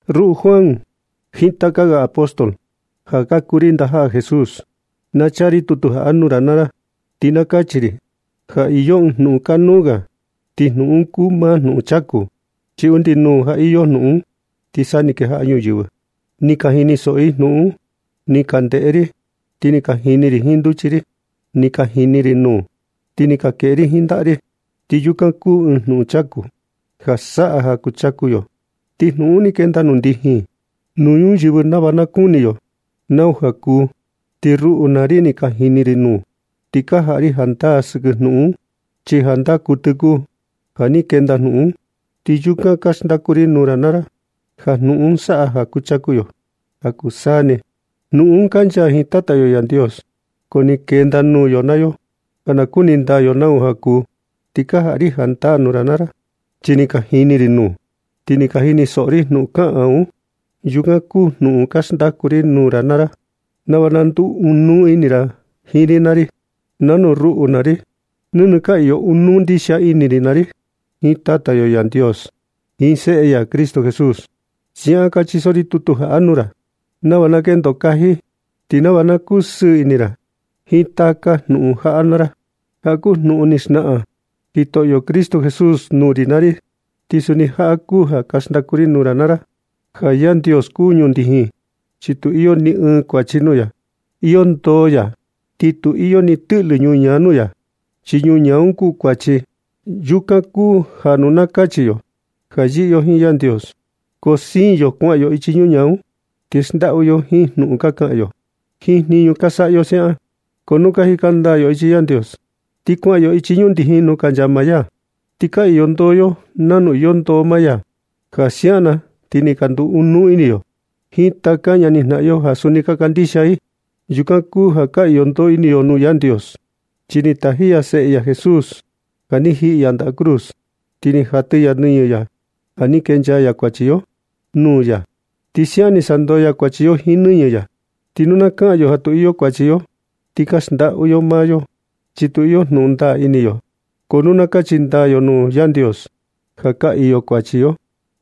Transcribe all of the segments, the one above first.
Ruꞌu Juan, jiin taka ga apóstol, ja ka kuu ri ndajaꞌa Jesús, na chaa ri tutu jaꞌa nuu ra naa ra. Ti na kachi ri ja iyo ɨɨn Jnuꞌun kanuu ga, ti Jnuꞌun un kuu maa Jnuꞌun chaku, chi undi nuu ja iyo Jnuꞌun un, ti sa ni kejaꞌa ñuyɨvɨ. Ni ka jinisoꞌo ri Jnuꞌun un. Ni ka ndeꞌe ri, ti ni ka jini ri jiin nduchi ri. Ni ka jini ri nuu, ti ni ka kueꞌe ri jiin ndaꞌa ri. Ti yukan kuu ɨɨn Jnuꞌun chaku ja saꞌa ja ka chaku yo. Ti Jnuꞌun un ni kenda nundijin nuu ñuyɨvɨ nava na kuni yo nau ja kuu. Ti ruꞌu naa ri ni ka jini ri nuu. Ti ka jaꞌa ri jandaa sɨkɨ Jnuꞌun un, chi jandaa kuɨtɨ kuu ja ni kenda Jnuꞌun un. Ti yukan ka xndaku ri nuu ra naa ra ja Jnuꞌun un saꞌa ja ka kuchaku yo ja kuu saa ni. Jnuꞌun un kancha jiin Tata yo Yandios, ko ni kenda nuu yo naa yo ja na kuni ndaa yo nau ja kuu. Ti ka jaꞌa ri jandaa nuu ra naa ra chi ni ka jini ri nuu, ti ni ka jinisoꞌo ri Jnuꞌun kaꞌan un. Yukan kuu jnuꞌun ka xndaku ri nuu ra naa ra nava na nduu ɨɨn nuu ini ra jiin ri naa ra. Nanu ruꞌu naa ri, nɨnɨ ka iyo ɨɨn nuu ndixia ini ri naa ri jiin Tata yo Yandios jiin Seꞌe ya Cristo Jesús. Siaꞌan ka chiso ri tutu jaꞌa nuu ra naa ra nava na kendo kaji, ti na kusɨɨ ini ra jiin taka jnuꞌun jaꞌa naa ra. Jaꞌa kuu jnuꞌun ni xnaꞌan Jitoꞌo Cristo Jesús nuu ri naa ri, ti suni jaꞌa kuu ja ka xndaku ri nuu ra naa ra ja Yandios kuu ñundijin chi tu iyo ni ɨɨn kuachi nuu ya, iyo ndoo ya, ti tu iyo ni tɨꞌlɨ ñuñaa nuu ya, chi ñuñaa un kuu kuachi. Yukan kuu ja nu na kachi yo ja yɨꞌɨ yo jiin Yandios, ko siin yo kuaꞌan yo ichi ñuñaa un, ti xndaꞌu yo jiin jnuꞌun ka kaꞌan yo, jiin jniñu ka saꞌa yo ja siaꞌan. Ko nu ka jika ndaa yo ichi Yandios, ti kuaꞌan yo ichi ñundijin nuu kancha maa ya, ti ka iyo ndoo yo nanu iyo ndoo maa ya. Ja siaꞌan na ti ni ka nduu ɨɨn nuu ini yo jiin taka ñani jnaꞌan yo ja suni ka kandixia i. Yukan kuu ja ka iyo ndoo ini yo nuu Yandios, chi ni taji ya Seꞌe ya Jesús ja ni jiꞌi ya ndaꞌa cruz, ti ni jatɨ ya nɨñɨ ya ja ni kenchaa ya kuachi yo nuu ya, ti siaꞌan ni sandoo ya kuachi yo jiin nɨñɨ ya. Ti nu ka kaꞌan yo ja tu iyo kuachi yo ti ka xndaꞌu yo maa yo, chi tu iyo jnuꞌun ndaa ini yo. Ko nu na kachi ndaa yo nuu Yandios ja ka iyo kuachi yo,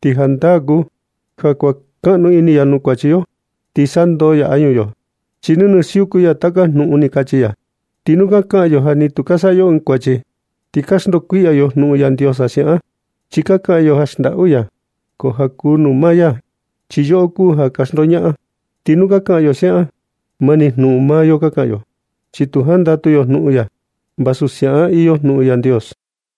ti jandaa kuu ja kuankaꞌnu ini ya nuu kuachi yo, ti sandoo ya añu yo, chi nɨnɨ siuku ya taka jnuꞌun ni kachi ya. Ti nu ka kaꞌan yo ja tu ka saꞌa yo ni ɨɨn kuachi, ti ka xndoo kuiꞌya yo jnuꞌun Yandios ja siaꞌan, chi ka kaꞌan yo ja xndaꞌu ya, ko ja kuu nuu maa ya chi yoꞌo kuu ja ka xndoñaꞌan. Ti nu ka kaꞌan yo siaꞌan, mani jnuꞌun maa yo ka kaꞌan yo, chi tu ka jandatu yo jnuꞌun ya, vasu siaꞌan iyo jnuꞌun Yandios.